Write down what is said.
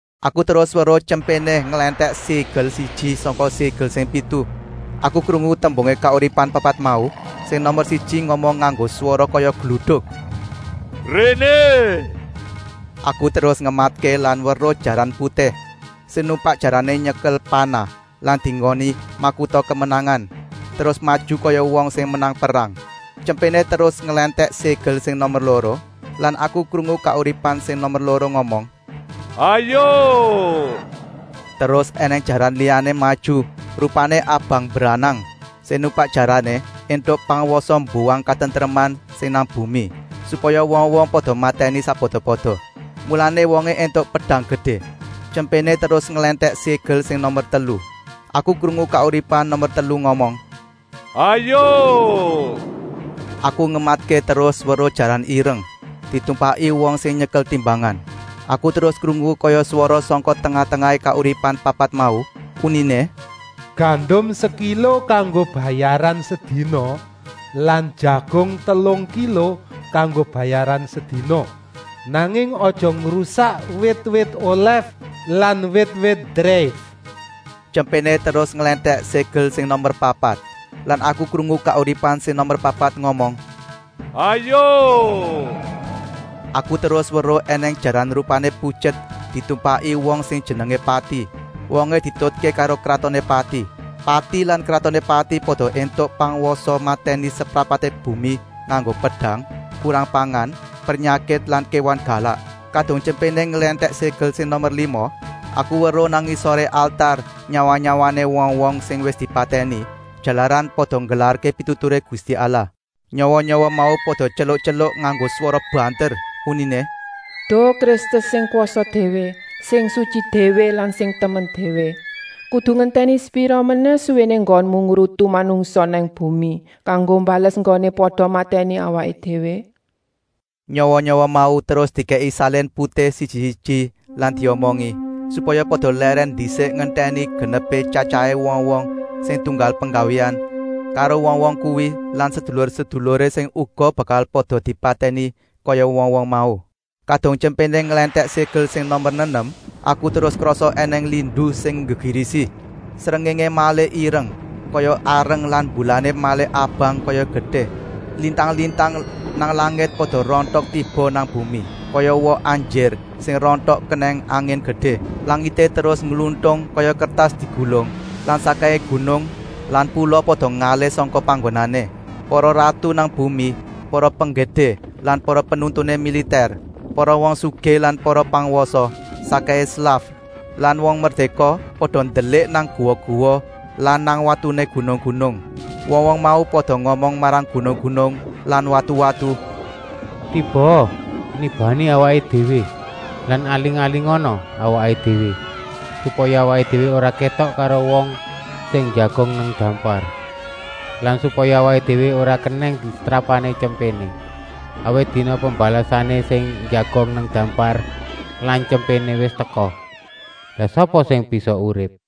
Aku terus weruh Tyempéné nglèntèk ségel siji sangka ségel sing pitu. Aku krungu tembungé kauripan papat mau sing nomer siji ngomong nganggo swara kaya gluduk: “Réné!” Aku terus ngematké lan weruh jaran putih. Sing numpak jarané nyekel panah lan dienggoni makuta kamenangan, terus maju kaya wong sing menang perang. Tyempéné terus nglèntèk ségel sing nomer loro lan aku krungu kauripan sing nomer loro ngomong: “Hayuk!” Terus ènèng jaran liyané maju, rupané abang mbranang. Sing numpak jarané éntuk pangwasa mbuwang katentreman sing nang bumi, supaya wong-wong pada matèni sakpada-pada. Mulané wongé éntuk pedang gedé. Tyempéné terus nglèntèk ségel sing nomer telu. Aku krungu kauripan nomer telu ngomong: “Hayuk!” Aku ngematké terus weruh jaran ireng, ditumpaki wong sing nyekel timbangan. Aku terus krungu kaya swara sangka tengah-tengahé kauripan papat mau, uniné: “Gandum sekilo kanggo bayaran sedina lan jagung telung kilo kanggo bayaran sedina. Nanging aja ngrusak wit-wit olèf lan wit-wit dreif.” Tyempéné terus nglèntèk ségel sing nomer papat lan aku krungu kauripan sing nomer papat ngomong: “Hayuk!” Aku terus weruh ènèng jaran rupané putyet ditumpaki wong sing jenengé Pati. Wongé dietutké karo kratoné Pati. Pati lan kratoné Pati pada éntuk pangwasa matèni seprapaté bumi nganggo pedang, kurang pangan, pernyakit lan kéwan galak. Kadung Tyempéné nglèntèk ségel sing nomer lima, aku weruh nang ngisoré altar nyawa-nyawané wong-wong sing wis dipatèni, jalaran pada nggelarké pituturé Gusti Allah. Nyawa-nyawa mau pada tyeluk-tyeluk nganggo swara banter, uniné: “Duh Kristus sing kwasa déwé, sing sutyi déwé lan sing temen déwé! Kudu ngentèni sepira menèh suwéné enggonmu ngrutu manungsa nang bumi, kanggo mbales enggoné pada matèni awaké déwé?” Nyawa-nyawa mau terus dikèki salin putih siji-siji lan diomongi, supaya pada lèrèn ndisik ngentèni genepé tyatyahé wong-wong sing tunggal penggawéan karo wong-wong kuwi lan sedulur-seduluré sing uga bakal pada dipatèni kaya wong-wong mau. Kadung Tyempéné nglèntèk ségel sing nomer nenem, aku terus krasa ènèng lindu sing nggegirisi. Srengéngé malih ireng kaya areng lan mbulané malih abang kaya getih. Lintang-lintang nang langit pada rontok tiba nang bumi, kaya woh anjir sing rontok kenèng angin gedé. Langité terus ngluntung kaya kertas digulung lan sakkèhé gunung lan pula pada ngalih sangka panggonané. Para ratu nang bumi, para penggedé lan para penuntuné militèr, para wong sugih lan para pangwasa, sakkèhé slaf lan wong merdéka pada ndelik nang guwa-guwa lan nang watuné gunung-gunung. Wong-wong mau pada ngomong marang gunung-gunung lan watu-watu: “Tibaa nibani awaké déwé lan aling-alingana awaké déwé, supaya awaké déwé ora kétok karo wong sing njagong nang dampar lan supaya awaké déwé ora kenèng setrapané Tyempéné. Awit dina pembalesané sing njagong nang dampar lan Tyempéné wis teka; lah sapa sing bisa urip?”